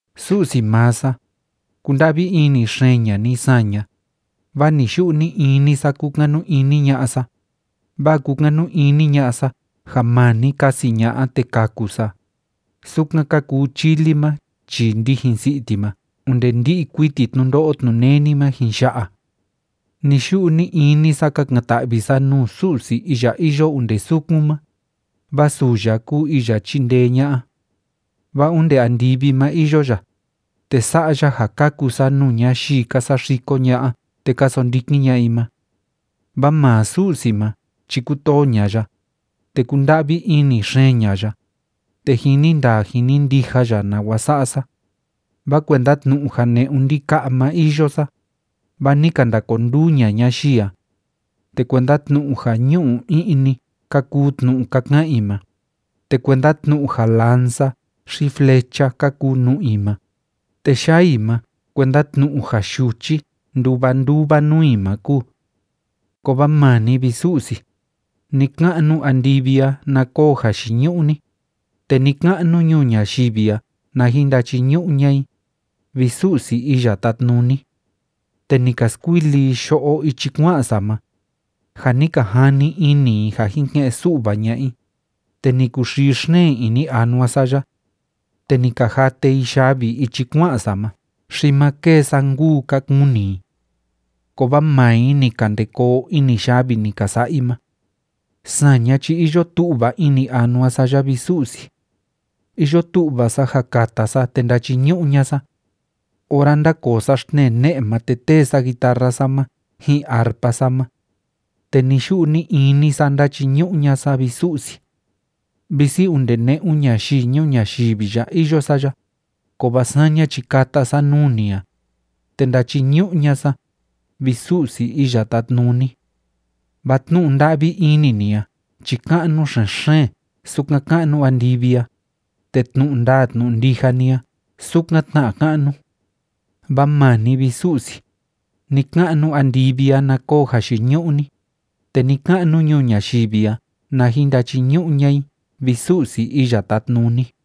Su'si maa sa, kunda'vi ini xeen ña'a ni saña, vaa ni‑yu'u ni‑ini sa kúkanu ini ña'a sa, vaa kúkanu ini ña'a sa ja maa ni kasi ña'a te kaku sa, sukan ka kuu chili ma chii ndijin si'i ti ma onde ndi'i kuiti tnundo'o tnuneni ma jin ya'a. Ni‑yu'u ni‑ini sa kakan‑ta'vi sa nuu Su'si iya iyo onde sukun ma, vaa suu ya kúu iya chíndee ña'a. Vaa onde andivi ma iyo ya, te sa'a ya ja kaku sa nuu ñayii ka saxiko ña'a te ka sondikin ña'a i ma. Vaa maa Su'si ma chi kútoo ña'a ya, te kúnda'vi ini xeen ña'a ya, te jini ndaa jini ndija ya nawa sa'a sa. Vaa kuenda tnu'u ja ne'un ndika'a ma iyo sa, vaa ni ka ndakonduu ña'a ñayii a. Te kuenda tnu'u ja ñu'u i'ni ka kuu tnu'u ka ka'an i ma, te kuenda tnu'u ja lanza xi flecha ka kuu nu'u i ma, te yaa i ma kuenda tnu'u ja yuchi nduva nduva nuu i ma kúu. Kovaa maa ni, vi Su'si, ni‑ka'nu andivi a na koo jayiñu'u ni, te ni‑ka'nu ñuu ñayivi a na jin ndachiñu'u ña'a i, vi Su'si Iya Tátnuni. Te ni ka skuili i yo'o ichi kua'an sa ma, ja ni ka jani ini i ja jin ke'en‑su'va ña'a i, te ni kuxii xeen ini anua sa ya. Te ni ka jate i yavi ichi kua'an sa ma xi ma kêe sa nkuu, ka kuni i. Kovaa maa i ni ka ndê koo ini yavi ni ka sa'a i ma. Saña chi iyo tu'va ini anua sa ya, vi Su'si. Iyo tu'va sa ja kata sa te ndachiñu'u ña'a sa. Ora ndákoo sa xtnee ne'e ma te tee sa guitarra sa ma ji'in arpa sa ma. Te ni‑yu'u ni‑ini sa ndachiñu'u ña'a sa, vi Su'si. Visi onde ne'un ñayii ñuu ñayivi ya iyo sa ya, kovaa saña chi kata sa nuu ni a, te ndachiñu'u ña'a sa, vi Su'si Iya Tátnuni. Vaa tnu'u nda'vi ini ni a chi ka'nu xen‑xeen sukan ka'nu andivi a, te tnu'u ndaa tnu'u ndija ni a sukan tna ka'nu. Vaa maa ni, vi Su'si, ni‑ka'nu andivi a na koo jayiñu'u ni, te ni‑ka'nu ñuu ñayivi a na jin ndachiñu'u ña'a i, vi Su'si Iya Tátnuni.